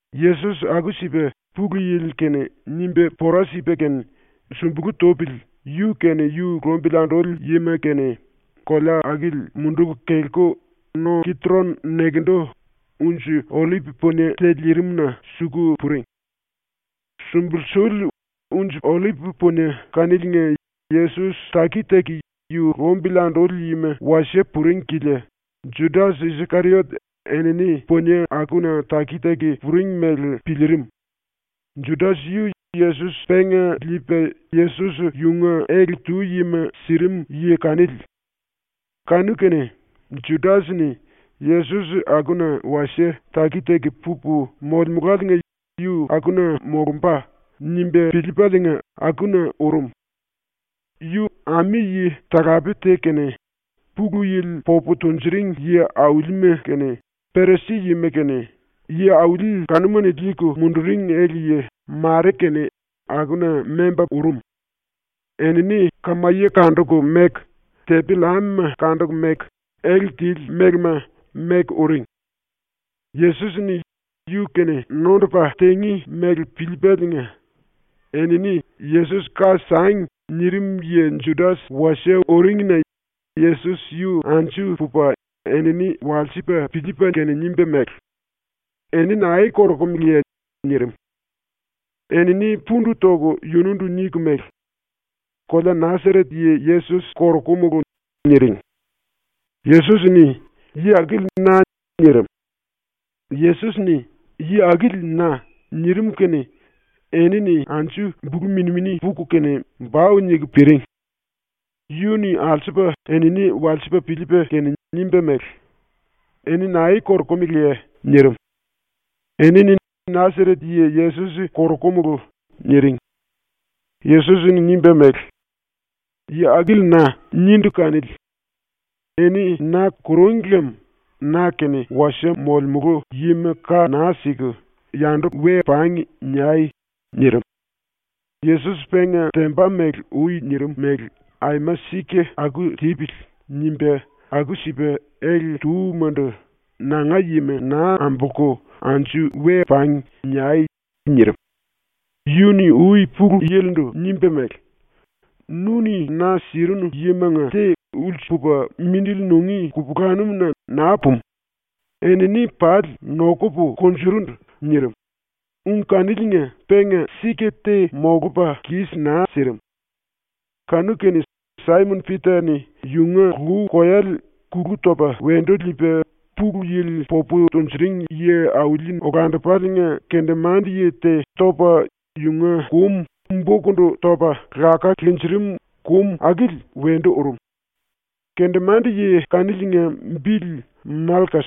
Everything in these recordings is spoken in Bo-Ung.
Yesos aku-sipa Pulu Yili-kene nimba pora sipa kene, ⸤sumbulu tupili⸥ yu kene yu lumbili anduli yima kene kolea akili munduku kelku no Kitron nekendu unji-ollip punie te lirimna suku puring. ⸤Sumbulsuli unji-ollip punie kaniliinga Yesos taki-taki yu lumbili anduli yima wasie puring kilia⸥ Judas-Iskeriot enini punie akuna taki-taki puring mele piliirim. Judas yu Yesos penga liipa Yesos yunga ele-tu yima sirim yi kanili. Kanu-kene Judas-ni ⸤‘Yesos akuna wasie taki-taki pupu molemuláliinga yu akuna molumba.’ nimba piliipaliinga,⸥ akuna urum. Yu ami-yi-talape te kene Pulu Yili popu tunjuring yi-aulima kene Perisi-yima kene yi-auli kanuma-ni liiku munduring ele-yi mare kene akuna memba urum. Enini kamaye kanduku meku, tepi-llamema kanduku meku, ele tili mélema meku uring. Yesos-ni yu-kene nondupa tingí mele piliipaliinga, enini ‘Yesos ka sangi.’ nirim yi Judas wasie uringina Yesos yu anju pupa enini walsipa piliipa kene nimba mele: “Eni nae korokumeleye?” nirim. Enini pundu toku yundu niku mele: “Kolea Nasaret yi Yesos korokumulu.” niring. Yesos-ni “Yi akili na.” nirim. Yesos-ni “Yi akili na.” nirim kene enini anju bulu mini-mini puku kene bau niku piring. Yu-ni alsupa enini walsipa piliipa kene nimba mele: “Eni nae korokumeleye?” nirim. Enini “Nasaret yi Yesos korokumulu.” niring. Yesos-ni nimba mele: “ “Yi akili na.” nindu kanili. Eni na kurúngi lem na-kene wasie molemulu yima ka naa siku ‘Yandu pangi.’ niai.” nirim. Yesos penga temba mele ui nirim mele ‘Aima sika aku tipili.’ nimba aku-sipa ele-túmandu “Nanga yima naa ambolku “Anju pangi.” niai.” nirim. Yu-ni ui Pulu Yili-ndu nimba mele: “Nu-ni na sirinu yimanga te ulsu pupa mindili nungí kupulanum-na naa pumu, enini pali nokupu kunjurundu.” nirim, ung kaniliinga penga sika te molupa kis naa sirim. Kanu-kene Saimon-Pita-ni yunga lu-koyale kulu topa wendu liipa Pulu Yili popu tunjuring yi-auli-olandupaliinga kendemande-yi te topa yunga kum bokundu topa laká linjirim, kum akili wendu urum. Kendemande-yi kaniliinga bili Malkas.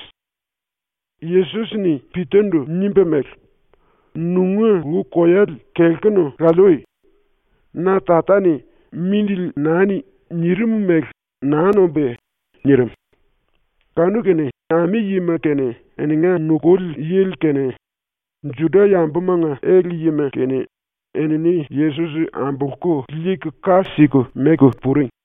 Yesos-ni Pita-ndu nimba mele: “Nunga lu-koyale kelkunu laliui! Na Tata-ni “Mindili nani.” nirim mele naa nombúye?” nirim. Kanu-kene ami-yima kene eninga nukuli yili kene Juda-yambumanga ele-yima kene enini Yesos ambolku liiku ka siku meku puring.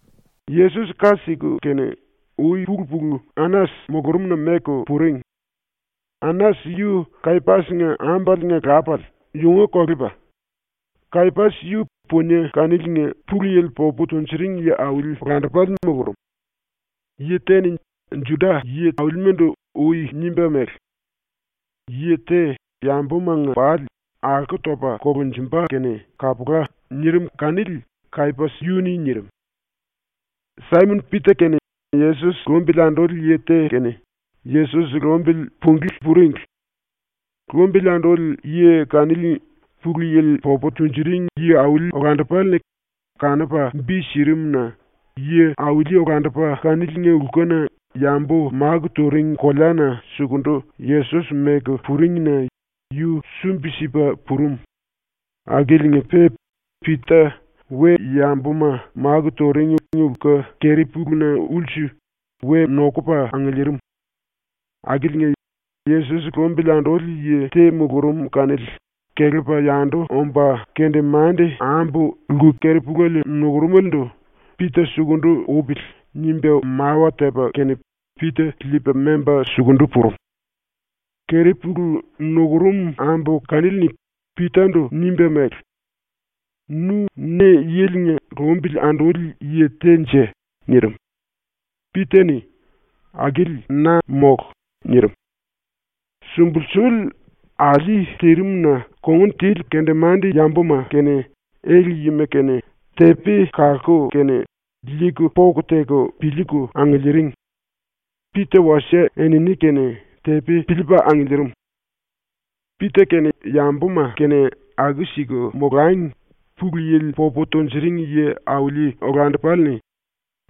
⸤Yesos ka siku kene⸥ ui-pulu-pulu Anas mulurumna meku puring. Anas yu Kayapas-nga ambaliinga lapale, yunga kolepa. Kayapas yu punie kaniliinga Pulu Yili popu tunjuring yi-auli-olandupale mulurum. Yi te-ni Juda yi-aulimandu ui nimba mele: “Yi te yambumanga pali alko topa kolunjumba kene kapula.” nirim kanili Kayapas yu-ni nirim. Saimon-Pita kene Yesos lumbili anduli yi te kene Yesos lumbili punglí puringli. Lumbili anduli yi kanili Pulu Yili popu tunjuring yi-auli-olandupale-ni kanupa bi sirim-na, yi-auli olandupa kaniliinga lkuna yambu máku turing koleana sukundu Yesos meku puringna yu sumbi-sipa purum akiliinga-pe Pita we-yambuma máku turing lku keri-puluna ulsu we nokupa angiliirim. Akiliinga Yesos lumbili anduli yi te mulurum kanili kelepa yandu omba kendemande-ambu lku keri-puléle nukurumelendu “Pita sukundu upili.” nimba mawa tepa kene Pita liipa memba sukundu purum. Keri-pulu nukurum ambu kanili-ni Pita-ndu nimba mele: “Nu ne-yilinga lumbili anduli yi te-nje?” nirim. Pita-ni “Akili na mólu!” nirim. Sumbulsuli alí tirim-na kongun tili kendemande-yambuma kene ele-yima kene tepi kalku kene liiku poku teku piliiku angiliiring. Pita wasie enini-kene tepi piliipa angiliirim. Pita kene yambuma kene aku-siku molangi Pulu Yili popu tunjuring yi-auli-olandupale-ni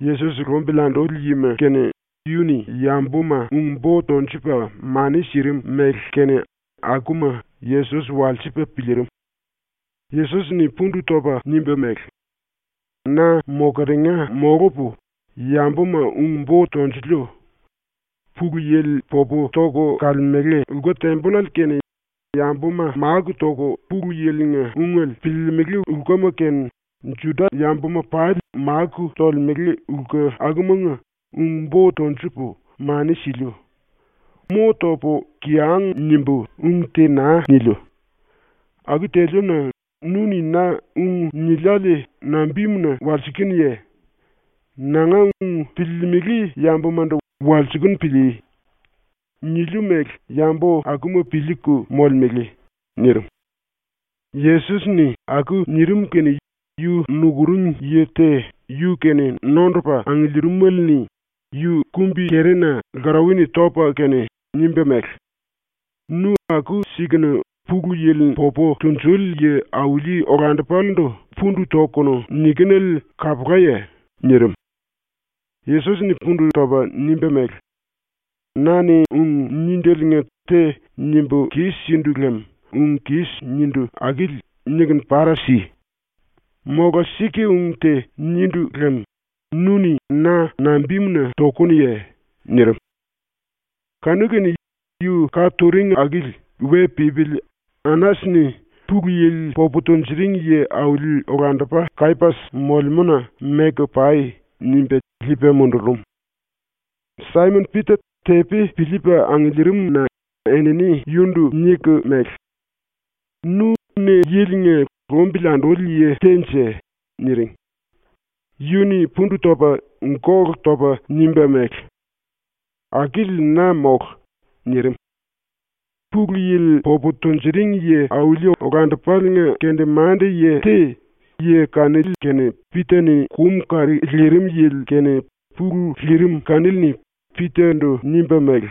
Yesos lumbili anduli yima kene yu-ni yambuma ung-bo tunjupa mani sirim mele kene akuma Yesos walsipa piliirim. Yesos-ni pundu topa nimba mele: “Na mokeringa molupu yambuma ung-bo tonjuliu. ⸤Pulu Yili popu toku kalemele⸥ lku-tembollale kene, yambuma máku toku Pulu Yili-nga ungele piliilimili lkuma kene Juda-yambuma pali máku tolemele lku akumanga ung-bo tonjupu mani siliu. Mo topu kiyang nimbu ung te naa niliu. Aku teliu-na nu-ni na ung niliále nambimuna walsikinuye? Nanga ung piliilimili yambumandu walsikunu pilíí. Niliu mele yambu akuma piliiku molemele.” nirim. Yesos-ni aku nirim kene yu nukuring yi te yu-kene nondupa angiliirimele-ni yu kumbi-kerina lkarauwa-ni topa kene nimba mele: “Nu aku-sikunu Pulu Yili popu tunjuli yi-auli-olandupalendu pundu tokunu nikinele kapulaye?” nirim. Yesos-ni pundu topa nimba mele: “Na-ni ung níndeliinga te nimbu kis-sindu lem ung kis nindu akili nikunu para si. Mola sika-ung te nindu lem nu-ni na nambimuna tokunuye?” nirim. Kanu-kene yu ka turing akili we pípili Anas-ni “Pulu Yili popu tunjuring yi-auli olandupa Kayapas molemúna meku pai.” nimba liipa mundurum. Saimon-Pita tepi piliipa angiliirim-na enini yundu niku mele: “Nu ne yilinga lumbili anduli yi te-nje?” niring. Yu-ni pundu topa ⸤gólu topa⸥ nimba mele: “Akili na mólu.” nirim. Pulu Yili popu tunjuring yi-auli-olandupaliinga kendemande-yi te, yi kanili kene Pita-ni kum kari lirim yili kene pulu lirim kanili-ni Pita-ndu nimba mele: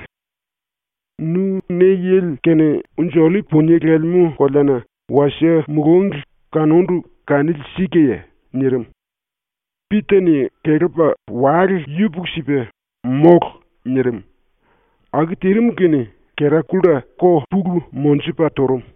“Nu ne-yili kene unji-ollip punie lelemú koleana wasie mulúngli kanundu kanili sikaye?” nirim. Pita-ni kelepa ⸤wale yupuku-sipa⸥ “Mólu.” nirim. Aku tirim kene kera-kulla ko pulu monjupa turum.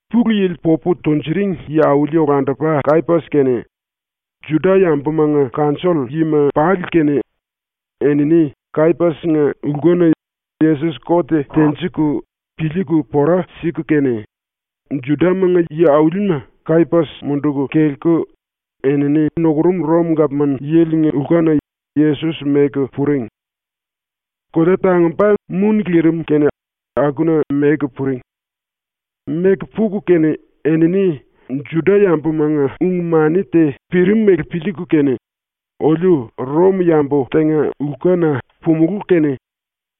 ⸤Pulu Yili popu tunjuring yi-auli-olandupa Kayapas kene Juda-yambumanga kanjoll-yima pali kene enini Kayapas-nga lkuna Yesos kot tenjiku piliiku pora siku kene,⸥ Judamanga yi-aulima Kayapas munduku kelku enini nukurum Rom gapman-yilinga lkuna Yesos meku puring. Kolea tangumba muni lirim kene akuna meku puring. Meku puku kene enini Juda-yambumanga ung-mani te pirimele piliiku kene ‘Oliu Rom-yambu tenga lkuna pumulú kene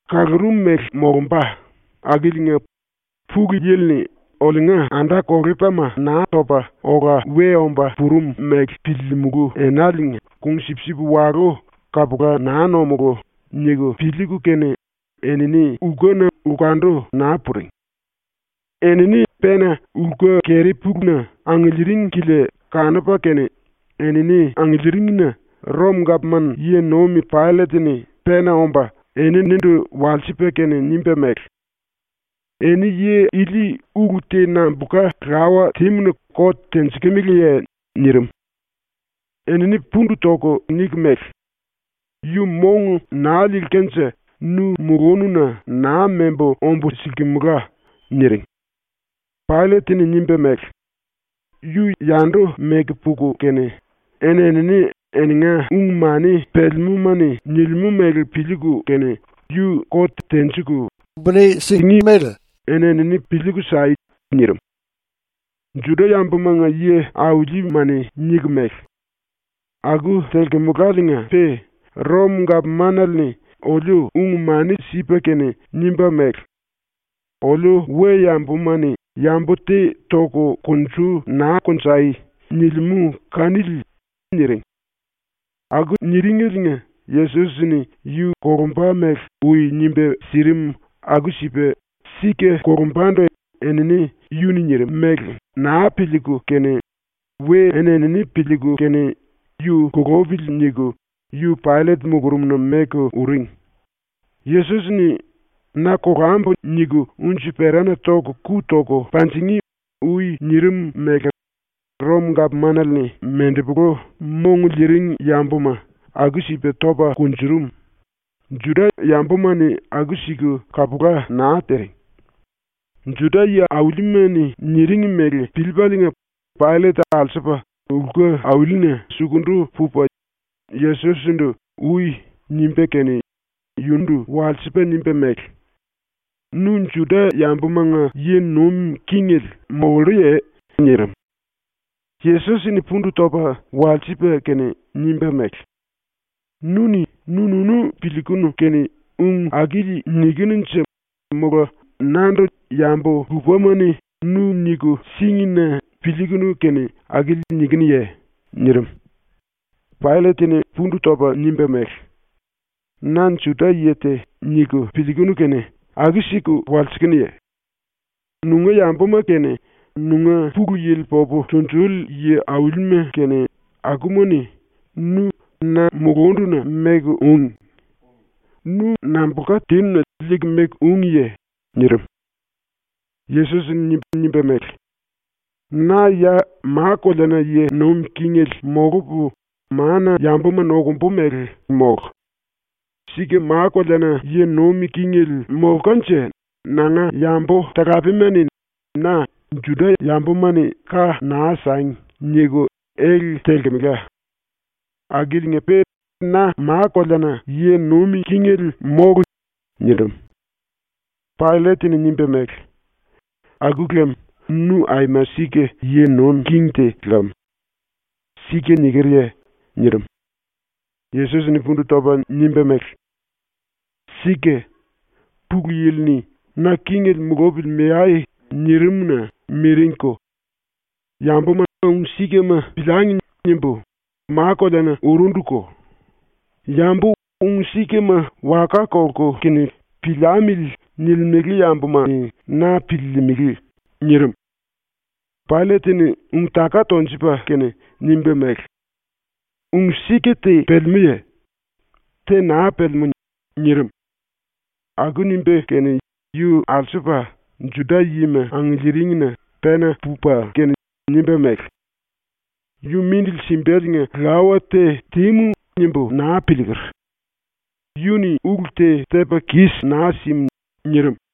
kalaru mele molumba akiliinga Pulu Yili-ni oliunga anda-kolepalima Naa Topa Ola We Omba Purum mele piliilimulu enaliinga kung-sipsip walú kapula naa nomulú.’ niku piliiku kene enini lkuna lkundu naa puring. Enini pena lku-keri-puluna angiliiring kilia kanupa kene enini angiliiringina Rom-gapman yi-nuim Paillet-ni pena omba eninindu walsipa kene nimba mele: “Eni yi ili ulu te nambulka lawa tímu-na kot tenjikimeleye?” nirim. Enini pundu toku niku mele: “Yu mong naa liilkanje nu mulununa naa membu ombu silkimela.” niring. Paillet-ni nimba mele: “Yu yandu meku puku kene eni-enini eninga ung-mani pelemúma-ni nilimú mele piliiku kene yu kot tenjiku buni singí mele eni-enini piliiku sai.” nirim. Juda-⸤yambumanga yi-auli⸥ma-ni niku mele: “Aku telkumulaliinga-pe Rom-gapmanale-ni oliu ung-mani sipa kene nimba mele: “Oliu we-yambuma-ni yambu te toku kunju naa konjai.” nilimú kanili.” niring. Aku niringeliinga Yesos-ni yu kolumba mele ui nimba sirim aku-sipa sika kolumbandu enini yu-ni nirim mele naa piliiku kene we eni-enini piliiku kene “Yu kulupili.” niku yu Paillet mulurumna meku uring. Yesos-ni “‘Na kolambu.’ niku unji-perana ⸤toku⸥ ku toku panjingí.” ui nirim mele ⸤Rom-gapmanale-ni mendepolu mong liiring yambuma aku-sipa topa kunjurum, Juda-yambuma-ni aku-siku kapula naa tiring⸥. Juda yi-aulima-ni niring mele piliipaliinga, Paillet alsupa lku-aulina sukundu pupa Yesos-ndu “Ui.” nimba kene yundu walsipa nimba mele: “Nu Juda-yambumanga yi nuim kingele molluye?” nirim. Yesos-ni pundu topa walsipa kene nimba mele: “Nu-ni nu-nunu piliikunu kene ung akili nikinunje mola nandu yambu lupama-ni nu niku síngi-na piliikunu kene akili nikinuye?” nirim. Paillet-ni pundu topa nimba mele: “Na ‘Juda-yi te.’ niku piliikunu kene aku-siku walsikinuye? Nunga yambuma kene nunga Pulu Yili popu tunjuli yi-aulima kene akuma-ni nu na mulunduna meku úngi. Nu nambulka tinu-na liiku meku úngiye?” nirim. Yesos-ni nimba mele: “Na ya ma-koleana yi nuim kingele molupu mana-yambuma nokumbu mele mólu. Sika ma-koleana yi nuim kingele molkanje nanga yambu-talapema-ni na “Juda-yambuma-ni ka naa sangi.” niku ele telkemela. Akiliinga-pe na ma-koleana yi nuim kingele mólu.” nirim. Paillet-ni nimba mele: “Aku lem nu aima sika yi nuim king te lam. Sika nikerye?” nirim. Yesos-ni pundu topa nimba mele: “Sika. Pulu Yili-ni ‘Na kingele mulupili meai.’ nirim-na miringko. ‘Yambuma ung-sikama piliangi.’ nimbu ma-koleana urunduko. Yambu ‘ung-sikama’ waka kolku kene ‘piliamili.’ nilimele yambuma-ni na piliilimili.” nirim. Paillet-ni ⸤ung-taka tonjupa kene⸥ nimba mele: “Ung-sika te pelemúye? Te naa pelemú.” nirim. Aku nimba kene yu alsupa Juda-yima angiliiringina pena pupa kene nimba mele: “Yu mindili simbaliinga lawa te tímu nimbu naa piliiker. Yu-ni ulu te tepa kis naa sim.” nirim.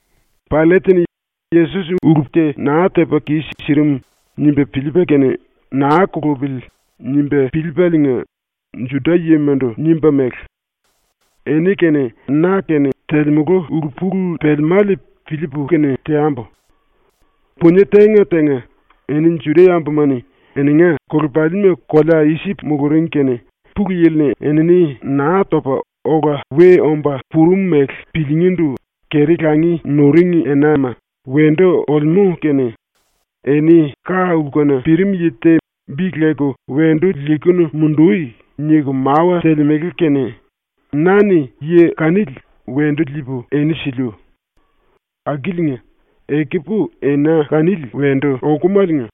Paillet-ni ⸤Yesos ulu te naa tepa kis-sirim nimba piliipa kene ‘Naa kulupili.’ nimba piliipaliinga⸥ Juda-yimandu nimba mele: “Eni kene na kene telemulu ulu-pulu pelemále piliipu kene teambu. Punie tenga-tenga, eni Juda-yambuma-ni eninga anda-kolepalima kolea Isip muluring kene Pulu Yili-ni enini Naa Topa Ola We Omba Purum mele piliingíndu keri-langi nuring enama wendu olemú kene eni ka-lkuna pirim yi te bi leku ‘Wendu liikunu mundui.’ niku mawa telemele kene na-ni yi kanili wendu liipu eni siliu. Akiliinga, ekupu ena kanili wendu okumaliinga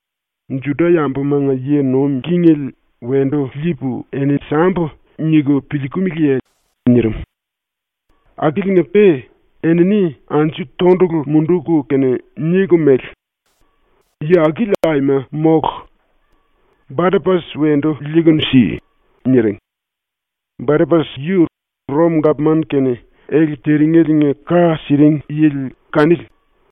‘Juda-yambumanga yi nuim kingele wendu liipu eni sambu.’ niku piliikimiliye?” nirim. Akiliinga-pe enini anju tondulu munduku kene niku mele: “Yi akili aima mólu. Barapas wendu liikunu si!” niring. (Barapas yu Rom-gapman-kene ele tirimeliinga ka siring yili kanili.)